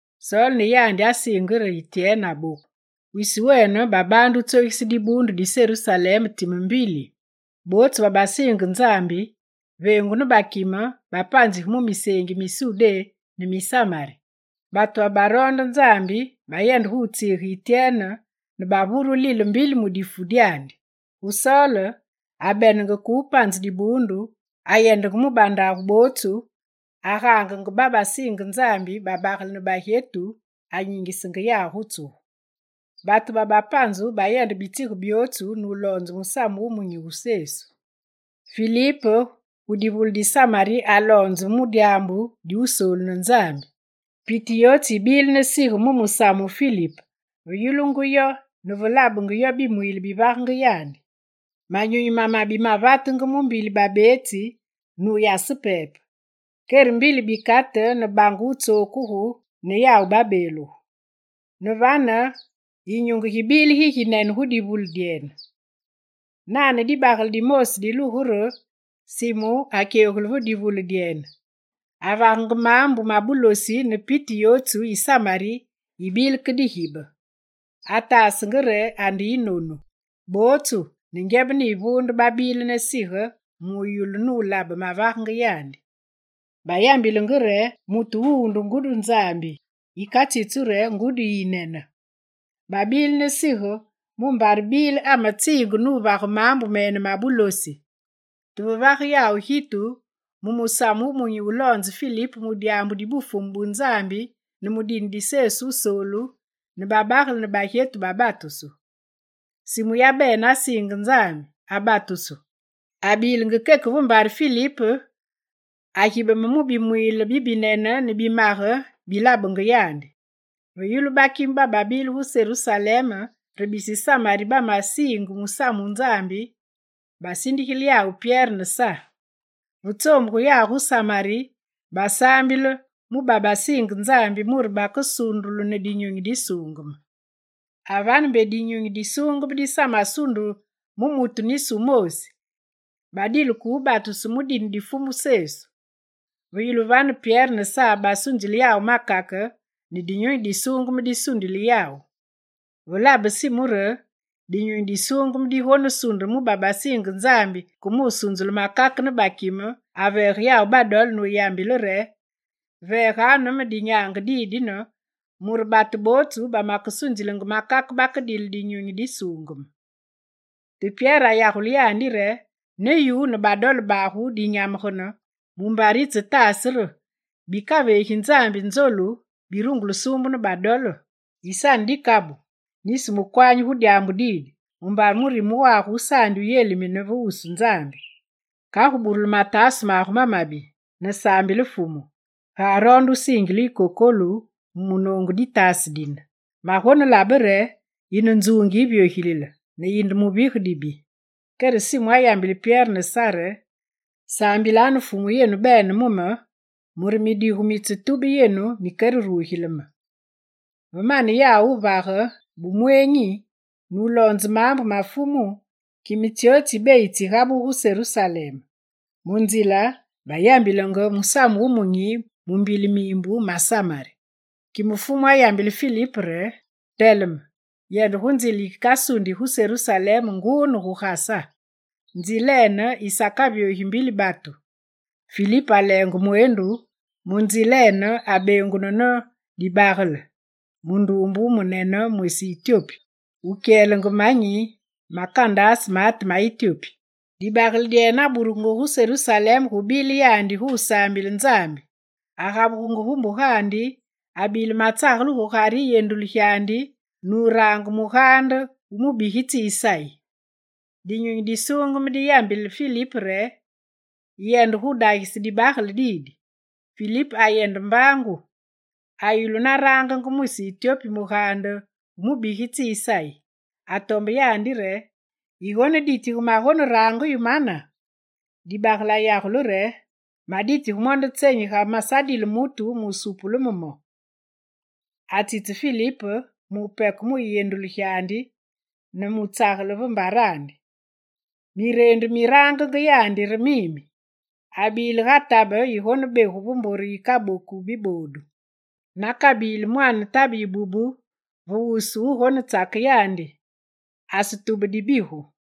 Sol ne yandi asiinge re Ityene aboku. Sol atsogise dibuundu Wisi wene babaande wutsogise dibuundu di Serusalem time mbili. Bootsu babasiinge Nzambi, veengu ne bakime, bapanzige mu miseengi mi Sudé ne mi Samari. Batu babaroonda Nzambi bayende gu wutsiige Ityene ne bavure wulile mu difu dyandi. Gu Sol, abenenge ke wupanze dibuundu, ayendenge gu bandagu bootsu, agaangenge babasiinge Nzambi, babagele ne bagyetu ne anyingisenge yawu gu tsugu. Batu babapanzu bayendenge bitsige byootsu nuloonze Musamu Wumunyi wu Sesu. Filip ayende gu divule di Samari ne aloonze mu dyaambu di Wusoolu ne Nzambi. Piti yootsu yibile ne sige mu musamu wu Filip ve yulungu yo ne ve labenge yo bimwiile bivangenge yandi. Manyunyi mamabi mavatenge mu mbili babeetsi nuyase pepe. Kere mbili bikate ne bange wutsokugu ne yawu babeeluge. Ne vane yinyunge gibile giginene gu divule dyene. Nane dibagele dimoosi dilugungu re Simu akyegulu gu divule dyene. Avagenge maambu ma bulosi ne piti yootsu yi Samari yibile ke digibe. Ataasenge re ande yinonu. Bootsu ne ngyebe ne yivuunde, babile ne sige mu wuyulu, nulabe mavagenge yandi. Bayambilenge re: «Mutu wuwu nde ngudi Nzambi, yikatsitsu re: “ngudi yiyinene.”» Babile ne sige mumbare bile ametsiinge nuvage maambu mene ma bulosi. Te ve vage yawu gitu mu Musamu Wumunyi wuloonze Filip mu dyaambu di Bufumu bu Nzambi ne mu dine di Sesu Wusoolu, ne babagele ne bagyetu babatusu. Simu yabene asiinge Nzambi, abatusu. Abilenge keke ve mbare Filip, agibeme mu bimwiile bibinene ne bimage bi labenge yandi. Ve yulu bakime bababile gu Serusalem re bisi Samari batsesiinge musamu wu Nzambi, basindigile yawu Pyere ne Sa. Ve tsoombugu yawu gu Samari, basaambile mu babasiinge Nzambi mure bakesundulu ne Dinyunyi Disuungeme. Avane, mbe Dinyunyi Disuungeme disamasunde mu mutu nisi wu moosi; badile ke wubatusu mu dine di Fumu Sesu. Ve yulu vane, Pyere ne Sa basunzile yawu makake ne Dinyunyi Disuungeme disundile yawu. Ve labe Simu re Dinyunyi Disuungeme digonesunde mu babasiinge Nzambi ke musunzulu makake ne bakime, aveege yawu badole nuyambile re: «Veeganu ne me dinyaange didine, mure batu bootsu ba makesunzilenge makake bakedile Dinyunyi Disuungeme.» Te Pyere ayagule yandi re: «Ne yu ne badole bagu dinyamegene, mumbare yitsetaase re bikaveegi Nzambi nzolu, birungulu wusuumbu ne badole! Yisane dikabu, nisi mukwanyi gu dyaambu didi mumbare murime wagu wusaandi wuyelimine ve wusu Nzambi. Kagu burule mataase magu mamabi ne saambile Fumu, ga aroonde wusiingile yu kokolu mu munoongu ditaase dine. Magonelabe re yine nzuungi yivyogilile, ne yinde muvige dibi.» Kere Simu ayambile Pyere ne Sa re: «Saambilanu Fumu yenu bene mu me, mure midigu mitsetube yenu mikererugile me.» Ve mane yawu wuvage bumweenyi, nuloonze maambu ma Fumu, kime tsyootsu tsi beyi tsigabugu gu Serusalem. Mu nzile bayambilenge Musamu wu Munyi mu mbili miimbu ma Samari. Kime Fumu ayambile Filip re: «Teleme, yende gu nzile yikasundi gu Serusalem nguu ne gu Gasa. Nzilene yisakavyogi mbili batu.» Filip aleenge mweendu, mu nzilene, abeengunu ne dibagele, munduumbe wumunene mwisi Ityopi, wukyelenge manyi ma Kandase maate ma Ityopi. Dibagele dyene aburugungu gu Serusalem gubile yandi gu wusaambile Nzambi. Agabugenge gu mbugandi, abile matsagele gugare yiyendulu gyandi nurange mugaande wu mubigitsi Isayi. Dinyunyi Disuungeme diyambile Filip re: «Yende gudagise dibagele didi.» Filip ayende mbaangu, ayulu na rangenge mwisi Ityopi mugaande wu mubigitsi Isayi. Atombe yandi re: «Yigoneditige magonerange yu mana?» Dibagele ayagule re: «Maditige mo nde tsenyi ga mesadile mutu wusupule me mo?» Atsitse Filip mupeke mu yiyendulu gyandi ne mutsagele va mbarandi. Mireendu mirangenge yandi re mimi: «Abile ga tabe yigonebegu ve mbure yikaboku biboodu, nakabili mwaane tabe yibubu ve wusu wugonetsake yandi. Asetube dibigu.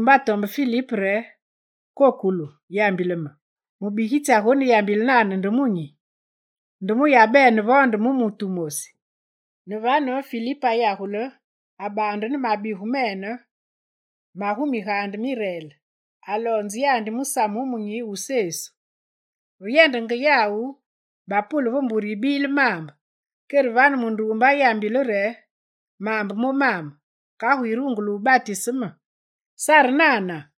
Munduumbe atombe Filip re: «Kokolu, yambile me, mubigitsi agoneyambile nane nde mu nyi? Nde mu yabene vo nde mu mutu wumosi?» Ne vane, Filip ayagule, abaande ne mabigu mene magu migaande mi Reel, aloonze yandi musamu wumunyi wu Sesu. Ve yendenge yawu, bapule ve mbure yibile maambe. Kere vane munduumbe ayambile re: «Maambe momame; kagu yirungule wubatise me, sare nana?» [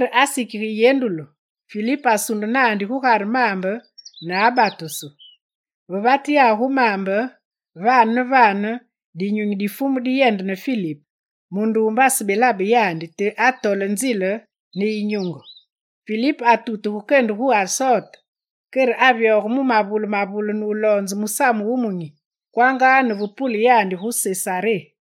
Kere asikige yiyendulu. Filip asunde naandi gugare maambe ne abatusu. Ve vate yawu gu maambe, vane ne vane, Dinyunyi di Fumu diyende ne Filip. Munduumbe asebelabe yandi, te atole nzile ne yinyunge. Filip atutuge kende gu Asote, kere avyoge mu mavule mavule nuloonzenge Musamu Wumunyi, kwanga ne ve pule yandi gu Sesaré.